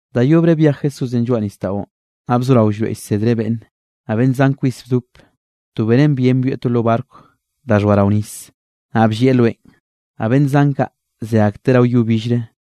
Da yobre byej Jesúsenꞌ lloaꞌ nisdaꞌon, naꞌ bzorao llroeꞌ llsedreꞌ beꞌnne, naꞌ beꞌnn zan kwis bdop, to benen bien byoeꞌ to lo barco da xhoa rao nis, naꞌ bllieꞌ loenꞌ naꞌ beꞌnn zan kaꞌ, ze akteꞌ rao yo billre.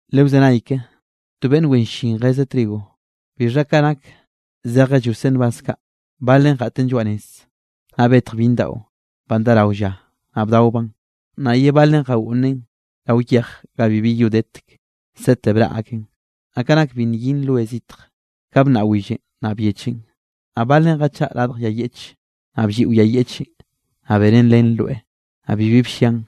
—Lewzenay ke, to beꞌnn wen llin jezeꞌ trigo. Bixha ka nak zejeꞌ lloseꞌ nbaz kaꞌ, balen jeꞌten lloaꞌ nez, naꞌ betj byinn daꞌo, banꞌ dá rao lla, naꞌ bdaobaꞌn. Naꞌ ye balen jagoꞌnnen rao yej ga bibi yo detek, sete braꞌ aken. Naꞌ ka nak bi nyin roe zitj, ka bnnaꞌ willenꞌ naꞌ byechen. Naꞌ balen jachaꞌa radj yay yeꞌche, naꞌ blliꞌo yay yeꞌchenꞌ, naꞌ benen len roeꞌ, naꞌ bibi bllian.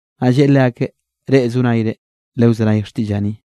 Naꞌll lleꞌe leakeꞌ: —Reꞌ zo nayre, lewzenay xtiꞌllaꞌ ni.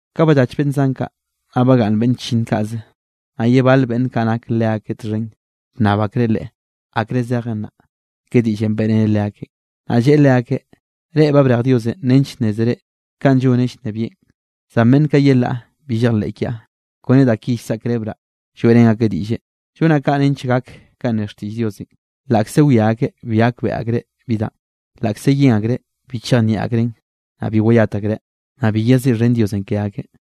Ka ballach beꞌnn zan kaꞌ, naꞌ bagaꞌnn beꞌnn chllinn kaꞌze, naꞌ ye bal beꞌnn kaꞌ nak leakeꞌ txhen, bnnab akreꞌ Leꞌe akre zejen naꞌ, ke diꞌllenꞌ beꞌreneꞌ leakeꞌ. Naꞌ lleꞌe leakeꞌ: —Reꞌ ba brej Diosenꞌ nench nnézere kanꞌ lloneꞌ llnebieꞌn, zan beꞌnn kaꞌ yelaꞌ bi llejleꞌ kiaꞌ, kone da ki llsaꞌkrebraꞌ lloeꞌrén akeꞌ diꞌlle. Llonaꞌ kaꞌ nench gak kanꞌ ne xtiꞌll Diosenꞌ: laꞌkze wia akeꞌ bi gakbeꞌe akreꞌ bi danꞌ, laꞌkze yen akreꞌ bi chejnieꞌ akreꞌn, naꞌ bi wayat akreꞌ, naꞌ bi yeziꞌxhen Dios ke akeꞌ.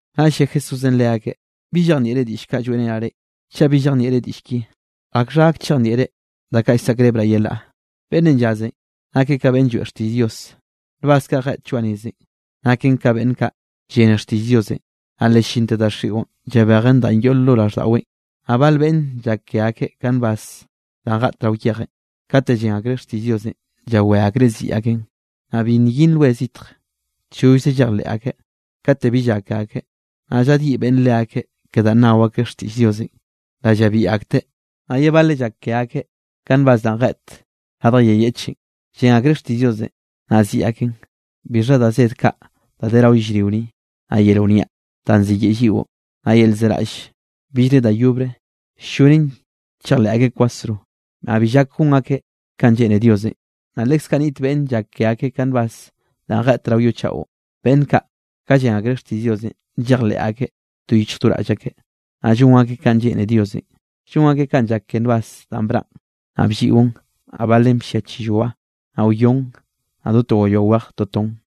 Naꞌll lle Jesúsenꞌ leakeꞌ: —¿Bi llejnieꞌre diꞌll kaꞌ lloeꞌrenaꞌ reꞌ? Chaꞌ bi llejnieꞌre diꞌll ki, ¿akxha gak chejnieꞌre da kaꞌ llsaꞌkrebraꞌ yelaꞌ? Beꞌnnenꞌ llazenꞌ nakeꞌ ka beꞌnn lloeꞌ xtiꞌll Dios. Nbaz kaꞌ jeꞌt lloaꞌ nezenꞌ naken ka beꞌnn kaꞌ llene xtiꞌll Diosenꞌ, naꞌ le ll-llinte daxiꞌon llabejen danꞌ yoꞌ lo raꞌlldaꞌweꞌn. Naꞌ bal beꞌnne llak ke akeꞌ ka nbaz danꞌ jeꞌt rao yejenꞌ, kate llen akreꞌ xtiꞌll Diosenꞌ llawé akreꞌ ziꞌi akeꞌn. Naꞌ bi nyin roe zitj, chollze llejleꞌ akeꞌ. Kate bi llak ke akeꞌ, naꞌ llaꞌdyiꞌ beꞌnn leakeꞌ ke danꞌ nao akeꞌ xtiꞌll Diosenꞌ, le llabiꞌ akteꞌ. Naꞌ ye bale llak ke akeꞌ ka nbaz danꞌ jeꞌt radj yay yeꞌchenꞌ. Llen akreꞌ xtiꞌll Diosenꞌ naꞌ ziꞌi akeꞌn, bixha da zed kaꞌ da de rao yellrio ni, naꞌ yel wniaꞌ danꞌ ziyeꞌe lliꞌo, naꞌ yel llzeraꞌll billre da yobre, ll-llonen chejleꞌ akeꞌ kwasro, naꞌ bi llak gon akeꞌ kanꞌ lleꞌne Diosenꞌ. Naꞌ leskaꞌ niꞌt beꞌnn llak ke akeꞌ ka nbaz danꞌ jeꞌt rao yo chaꞌon. Beꞌnn kaꞌ, ka llen akreꞌ xtiꞌll Diosenꞌ, llejleꞌ akeꞌ do yichj do raꞌll akeꞌ, naꞌ llon akeꞌ kanꞌ lleꞌne Diosenꞌ, llon akeꞌ kanꞌ llak ke nbaz danꞌ braꞌn, naꞌ blliꞌon, naꞌ balen bllia chilloa, naꞌ wyon, naꞌ do to gayoa wej toton.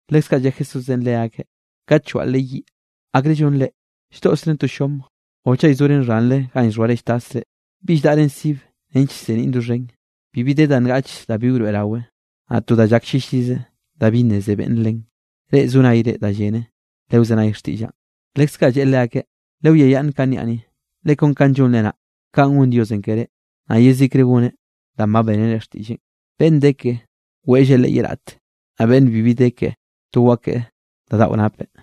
Leskaꞌ lle Jesúsenꞌ leakeꞌ: —Kat llwaꞌlre yiꞌ, ¿akre llonre? ¿Lldoꞌsren to llom o chaꞌ llzoren xhanre ganꞌ llxhoare lltasre? ¿Bi lldaꞌren sib nench llseniꞌn doxhen? Bibi de da ngaꞌch da bi wroeꞌrawe, naꞌ to da llak llillize da bi nneze beꞌnne len. Reꞌ zo nayre da llene, lewzenay xtiꞌllaꞌn. Leskaꞌ lleꞌe leakeꞌ: —Lewiayaꞌnn kanꞌ niaꞌ ni. Le kon kanꞌ llonre naꞌ, kaꞌn gon Diosenꞌ ke reꞌ. Naꞌ yezikre goneꞌ danꞌ ba bénere xtiꞌlleꞌn. Beꞌnn de keꞌe, weꞌlleꞌ leꞌe ye raꞌte, naꞌ beꞌnnenꞌ bi de keꞌe, to wakeꞌe da daꞌo napeꞌ.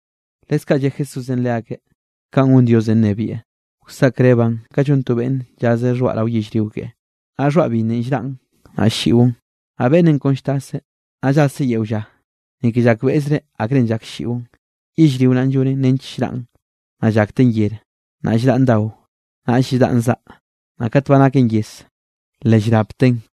Leskaꞌ lle Jesúsenꞌ leakeꞌ: —Kanꞌ gon Diosenꞌ nnebieꞌ, wsaꞌkrebaꞌn ka llon to beꞌnn llazeꞌ xhoaꞌ rao yellrio keꞌe. Naꞌ xhoaꞌ binnenꞌ llraꞌn naꞌ ll-lliꞌon, naꞌ beꞌnnenꞌ kon lltaseꞌ, naꞌ llaseꞌ yeo lla, ni ke llakbeꞌzreꞌ akrenꞌ llak ll-lliꞌon. Yellrio naꞌn llonen nench llraꞌn, naꞌ llakten yer, naꞌll llraꞌn dao, naꞌ lldaꞌn zaꞌ. Naꞌ kat ba naken yez, le llrapteꞌn.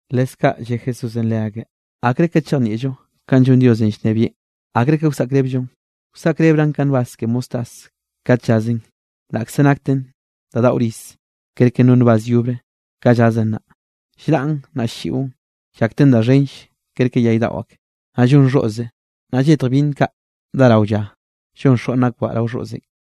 Leskaꞌ lle Jesúsenꞌ leakeꞌ: —¿Akre ka chejnieꞌllo kanꞌ llon Diosenꞌ llnebieꞌn, akre ke wsaꞌkrébellon? Wsaꞌkrebraꞌn ka nbaz ke mostaz, kat llazeꞌn, laꞌkze nakten da daꞌo rize kerke no nbaz yobre, ka llazeꞌn naꞌ, llraꞌn naꞌ ll-lliꞌon, llakten da xhenll kerke yay daꞌo ake, naꞌ llon xhoꞌze, naꞌ lletj byinn kaꞌ dá rao lla, llon xoꞌn akbaꞌ rao xoꞌzenꞌ.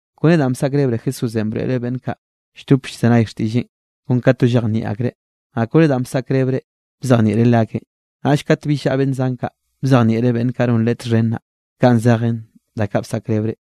Kone danꞌ bsaꞌkrebre Jesúsenꞌ broeꞌreꞌ beꞌnn kaꞌ lldop llzenay xtiꞌlleꞌn kon ka to llejnieꞌ akreꞌ. Naꞌ kone danꞌ bsaꞌkrebreꞌ bzejnieꞌreꞌ leakeꞌ, naꞌll kat bill llaꞌa beꞌnn zan kaꞌ, bzejnieꞌreꞌ beꞌnn kaꞌ non Leꞌe txhen naꞌ, kanꞌ zejen da kaꞌ bsaꞌkrebreꞌ.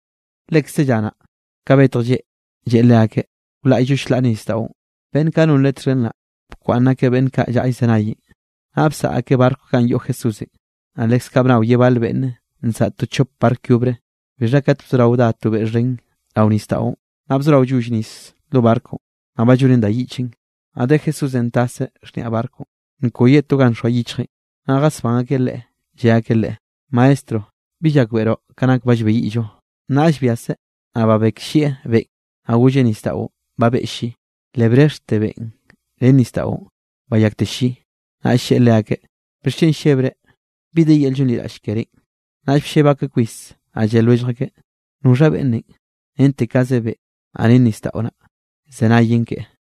Lekze lla naꞌ, ka betj lleꞌ, lleꞌe leakeꞌ: —Wlaꞌyllo chlaꞌre nisdaꞌon. Beꞌnn kaꞌ non Leꞌe txhen naꞌ, bkwaꞌnn akeꞌ beꞌnn kaꞌ llaꞌa llzenayenꞌ, naꞌ bsaꞌa akeꞌ barco ganꞌ ba yoꞌ Jesúsenꞌ, naꞌ leskaꞌ bnao ye bal beꞌnn nsaꞌa to chop barco yobre. Bixha kat bzorao dá to beꞌ xhen rao nisdaꞌon, naꞌ bzorao lloll nis lo barconꞌ, naꞌ ba llonen da yiꞌchen. Naꞌ de Jesúsenꞌ taseꞌ xhniaꞌ barconꞌ nkoyeꞌ to ga nxoa yichjeꞌn, naꞌ jasbán akeꞌ Leꞌe, lle akeꞌ Leꞌe: —¡Maestro! ¿Bi llakbeꞌroꞌ ka nak ba llbeyiꞌllo? Naꞌll byaseꞌ, naꞌ babekllieꞌ beꞌn, naꞌ golleꞌ nisdaꞌon: —¡Babeꞌ lli! Le brexhte beꞌn ren nisdaꞌon, bayakte lli. Naꞌll lleꞌe leakeꞌ: —¿Bixchen llebre? ¿Bi de yel llonliraꞌll ke reꞌn? Naꞌll blleb akeꞌ kwis, naꞌ lle lwellj akeꞌ: —¿Noxha beꞌnnenꞌ? Rente kaze beꞌ, naꞌ ren nisdaꞌo naꞌ llzenayen keꞌe.